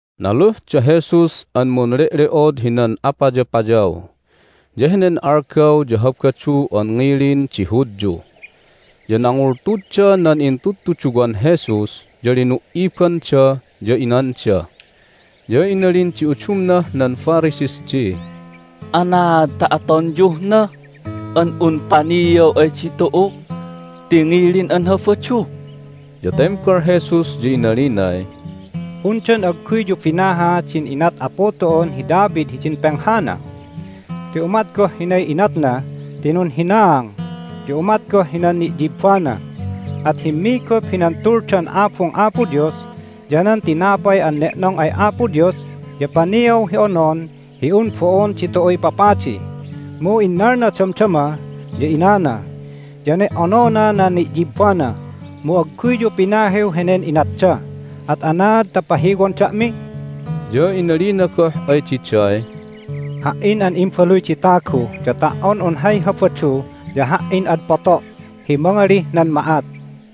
Naluh da Jesus an munle'le'od hinan apayapayaw, ya henen algaw ya Habadu an ngilin di Hudyu. Ya nangultudda nan intudtuduwan Jesus, ya linu"ibanda, ya inanda. Ya inalin di udumnah nan Pharisees di, "Anaad ta atonyuh na? An un paniaw ay ditu'u ti ngilin an Habadu!" Ya tembal Jesus, ya inalinay, "Undan agguyyu binaha din inat Apu tu'un hi David hidin penghana? Ti umat goh hinay inatna ti nunhinaang, ya umat goh hinan ni'yibbana. At himmigup hinan Tuldan Abung Apo Dios, ya nan tinapay an ne'nong ay Apo Dios ya paniaw hi onon hi un bo'on ditu'uy papadi. Mu innalna damdama, ya inana, ya ne"onona nan ni'yibbana. Mu agguyyu pinahiw henen inatda, at anaad ta pahiwon da'mi?" Ya inalina goh ay diday, "Ha"in an Imbaluy di Tagu ya ta"on un hay Habadu ya Ha"in ad poto' hi mangalih nan ma'at."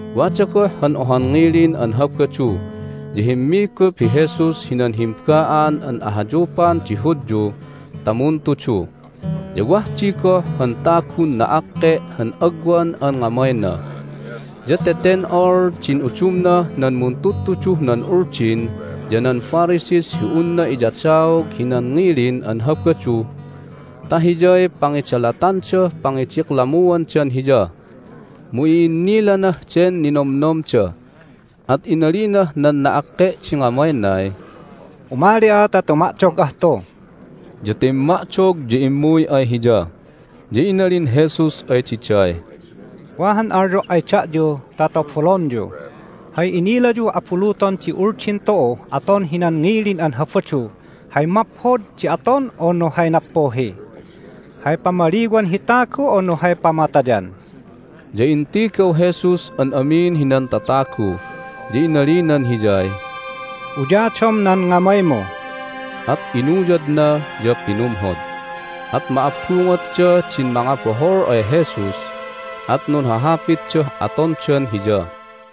Wada goh han ohan ngilin an Habadu ya himmigup hi Jesus hinan himba'an an ahayupan di Hudyu ta muntudu. Ya wah di goh han tagun na'akke' han agwan an ngamayna. Ya teten'ol din udumnah nan muntudtuduh nan Uldin ya nan Pharisees hi unna iyadaog hinan ngilin an Habadu ta hiyay pangidalatandah pangidiklamuandan Hiya. Mu i'innilanah den ninomnomda, at inalinah nan na'akke' di ngamaynay, "Umali'a ta tuma'dog'ah tu." Ya timma'dog, ya immuy ay Hiya. Ya inalin Jesus ay diday, "Wa han alyo' ay da'yu ta tobolonyu. Hay inilayuh abuluton di Uldin tu'uh aton hinan ngilin an Habadu---hay maphod di aton, unu hay nappuhi? Hay pamaliwan hi tagu, unu hay pamatayan?" Ya intigaw Jesus an amin hinan tatagu, ya inalinan hiyay, "Uyadom nan ngamaymu." At inuyadna, ya pinumhod. At ma'abbungotda din mangabohol ay Jesus, at nunhahapitdah atondan Hiya.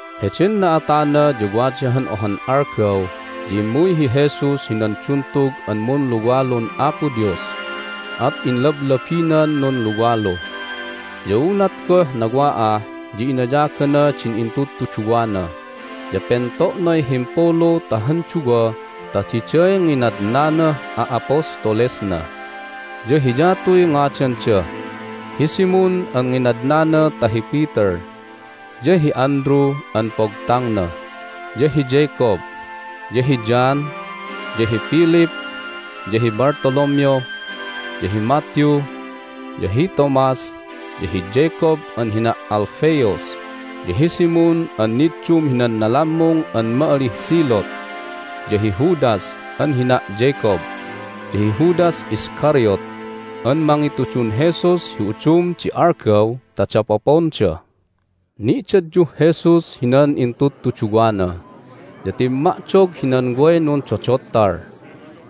Heden na'atana ya wada han ohan algaw ya immuy hi Jesus hinan duntug an munluwalun Apo Dios, at inlablabinan nunluwalu. Ya unat goh nawa'ah ya inayagana din intudtuduwana, ya pento'nay himpulu ta han duwa ta diday nginadnanah a'apostolesna. Ya hiyatuy ngadanda: hi Simon (an nginadnana ta hi Peter), ya hi Andrew (an pogtangna), ya hi Jacob, ya hi John, ya hi Philip, ya hi Bartholomew, ya hi Matthew, ya hi Thomas, ya hi Jacob (an hina' Alphaeus), ya hi Simon (an niddum hinan nalammung an ma'alih Zealot), ya hi Judas (an hina' Jacob), ya hi Judas Iscariot (an mangitudun Jesus hi udum di algaw ta dapoponda). Ni'dadyuh Jesus hinan intudtuduwana, ya timma'dog hinan way nundodottal.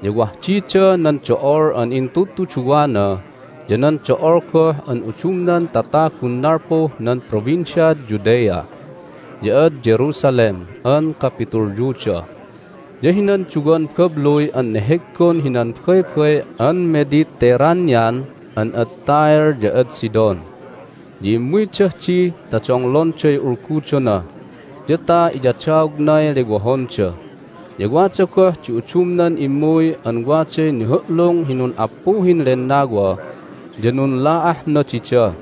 Ya wah dida nan do'ol an intudtuduwana ya nan do'ol goh an udumnan tatagun nalpuh nan Provinciad Judea, ya ad Jerusalem an kapitulyuda, ya hinan duwan babluy an neheggon hinan Baybay an Mediterranean an ad Tyre ya ad Sidon. Ya immuydah di ta donglonday ulgudona, ya ta iyadaognay lewohonda. Ya wada goh di udumnan immuy an waday nihu'lung hi nun'appuhin lennawa, ya nunla'ahna dida.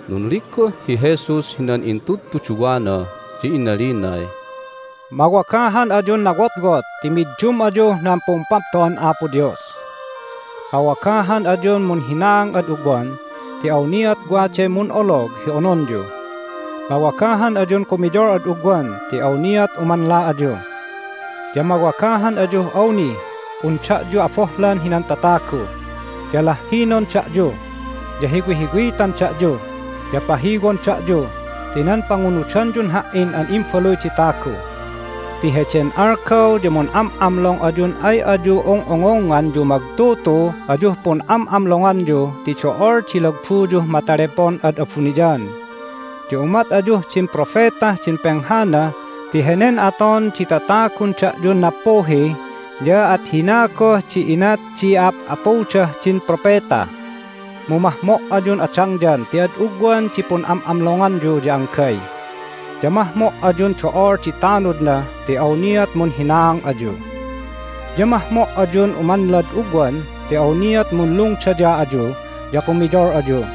Nunligguh hi Jesus hinan intudtuduwana, ya inalinay, "Mawagahan ayun nawotwot ti middum ayuh nan Pumpapto'an Apo Dios! Mawagahan ayun munhinaang ad ugwan ti awniat waday mun'olog hi ononyu! Mawagahan ayun kumiyol ad ugwan ti awniat umanla ayu! Ya mawagahan ayuh awnih un da'yu abohlan hinan tatagu, ya lahhinon da'yu, ya hiwihiwitan da'yu, ya pahiwon da'yu ti nan pangunudanyun Ha"in an Imbaluy di Tagu. Ti heden algaw ya mun'am'amlong ayun ay ayu ung'ungungngan yumagtutu ayuh pun'am'amlonganyu ti do'ol di lagbuyuh matalepon ad abuniyan! Ya umat ayuh din propetah din penghana ti henen aton di tatagun da'yun nappuhi ya at hina goh di inat di ap'apudah din propeta. Mu mahmo' ayun adangyan ti ad ugwan di pun'am'amlonganyu ya anggay! Ya mahmo' ayun do'ol di tanudna ti awniat munhinaang ayu. Ya mahmo' ayun umanlad ugwan ti awniat munlungdaya ayu ya kumiyol ayu.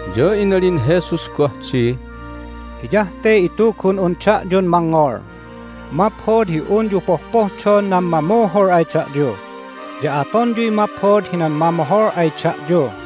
Ya inalin Jesus goh di, "Hiyah te itugun'un da'yun mangngol: maphod hi unyu pohpohdon nan mamuhul ay da'yu, ya atonyuy maphod hinan mamohol ay da'yu.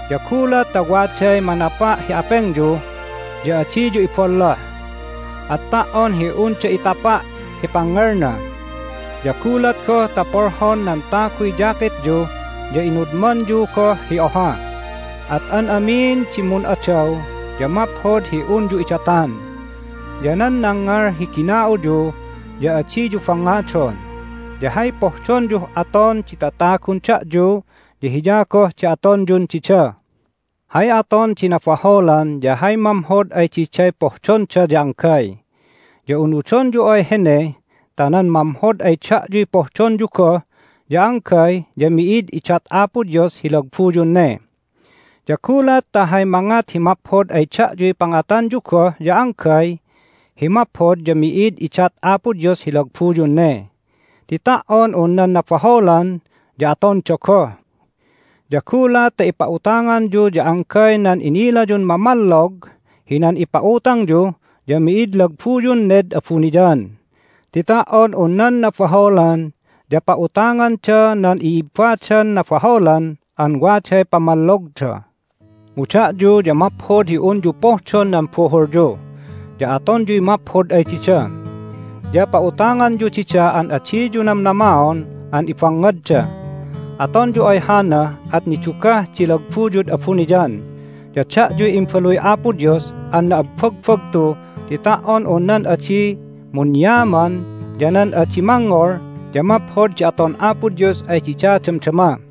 Ya gulat ta waday manapa' hi apengyu ya adiyu iballoh, at ta"on hi unda itapa' hi pangngelna. Ya gulat goh ta polhon nan taguy jacketyu ya inudmanyu goh hi oha. At an amin di mun'adaw ya maphod hi unyu idatan. Ya nan nangngal hi gina'uyu ya adiyu bangngadon. Ya hay pohdonyuh aton di tatagun da'yu ya hiya goh di atonyun dida. Hay aton di nabaholan ya hay mamhod ay diday pohdonda ya anggay. Ya unudonyu ay hene ta nan mamhod ay da'yuy pohdonyu goh ya anggay ya mi'id idat Apo Dios hi lagbuyun ne. Ya gulat ta hay mangat hi maphod ay da'yuy pangatanyu goh ya anggay hi maphod ya mi'id idat Apo Dios hi lagbuyun ne, ti ta"on un nan nabaholan ya atonda goh. Ya gulat ta ipa'utanganyu ya anggay nan inilayun mamallog hinan ipa'utangyu ya mi'id lagbuyun ned abuniyan, ti ta"on un nan nabaholan ya pa'utanganda nan i'ibbadan nabaholan an waday pamallogda. Mu da'yu ya maphod hi unyu pohdon nan buhulyu, ya atonyuy maphod ay dida. Ya pa'utanganyu dida an adiyu namnamaon an ibangngadda. Atonyu ay hana at nidugah di lagbuyud abuniyan, ya da'yuy imbaluy Apo Dios an na'abbagbagtu ti ta"on un nan adi munyaman ya nan adi mangngol ya maphod di aton Apo Dios ay dida damdama.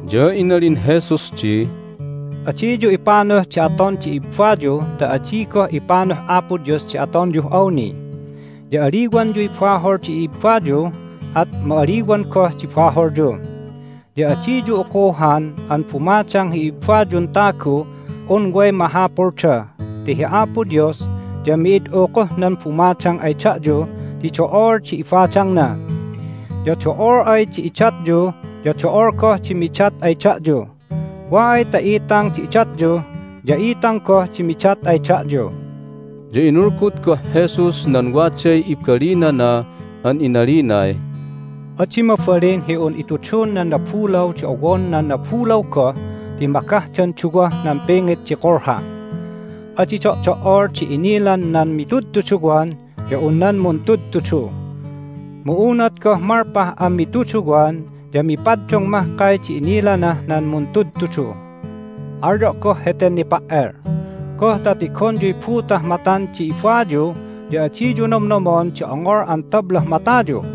Ya inalin Jesus di, "Adiyu ipanuh di aton di ibbayu ta adi goh ipanuh Apo Dios di atonyuh awni. Ya aliwanyuy bahol di ibbayu, at ma'aliwan goh di baholyu. Ya adiyu ukuhan an bumadang hi ibbayun taguh un way mahapulda, ti hi Apo Dios ya mi'id ukuhnan bumadang ay da'yu ti do'ol di ibadangna. Ya do'ol ay di idatyu ya do'ol goh di midat ay da'yu. Wa ay ta itang di idatyu ya itang goh di midat ay da'yu." Ya inulgud goh Jesus nan waday ibalinana an inalinay, "Adi mabalin hi un itudun nan nabulaw di owon nan nabulaw goh ti magahdan duwah nan pingit di kulha. Adi do'do"ol di inilan nan mitudtuduwan ya un nan muntudtudu. Mu unat goh malpah an mituduwan ya mipaddung mahkay di inilanah nan muntudtudu. Alyo' goh heten nipa"el: Goh ta tigonyuy butah matan di ibayu, ya adiyu nomnomon di ongol an tablah matayu?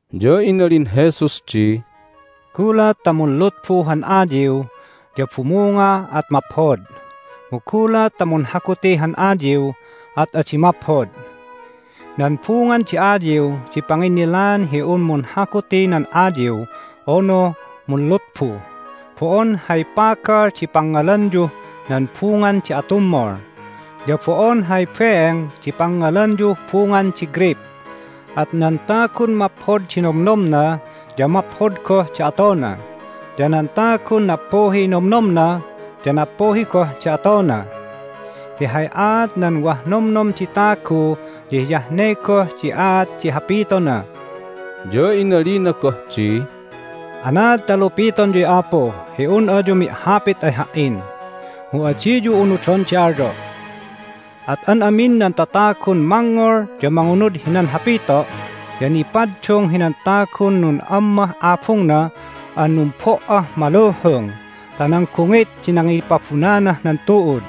Ya inalin Jesus di, "Gulat ta munlutbu han ayiw ya bumunga at maphod. Mu gulat ta munhaguti han ayiw at adi maphod. Nan bungan di ayiw di panginnilaan hi un munhaguti nan ayiw unu munlutbu. Bo'on hay pagal di pangngalanyuh nan bungan di atummol, ya bo'on hay beeng di pangngalanyuh bungan di greyp. At nan tagun maphod di nomnomna ya maphod goh di atona, ya nan tagun nappuhiy nomnomna ya nappuhi goh di atona. Ti hay aat nan wah nomnom di tagu ya hiyah ne goh di aat di hapitona." Hay Aat nan Duwan Nun'ammah Abungda Ya inalina goh di, "Anaad ta lupitonyuy, Apu, hi un ayu mi'hapit ay Ha"in, mu adiyu unudon di alyo'? At an amin nan tatagun mangngol ya mangunud hinan hapito' ya nipaddung hinan tagun nun'ammah abungna an numbo"ah maluhung ta nan gungit di nangipabunanah nan tu'ud.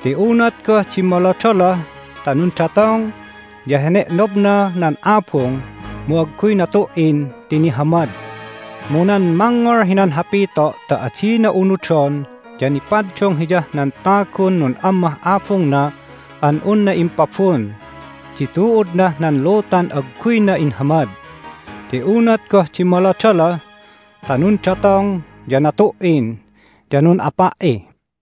Ti unat goh dimmolodoloh ta nundatong ya hene'nobna nan abung, mu agguy natu"in ti nihamad. Mu nan mangngol hinan hapito' ta adina unudon ya nipaddung hiyah nan tagun nun'ammah abungna an unna impabun di tu'udnah nan lutan agguyna inhamad. Ti unat goh dimmolodoloh ta nundatong ya natu"in, ya nun'apa"i."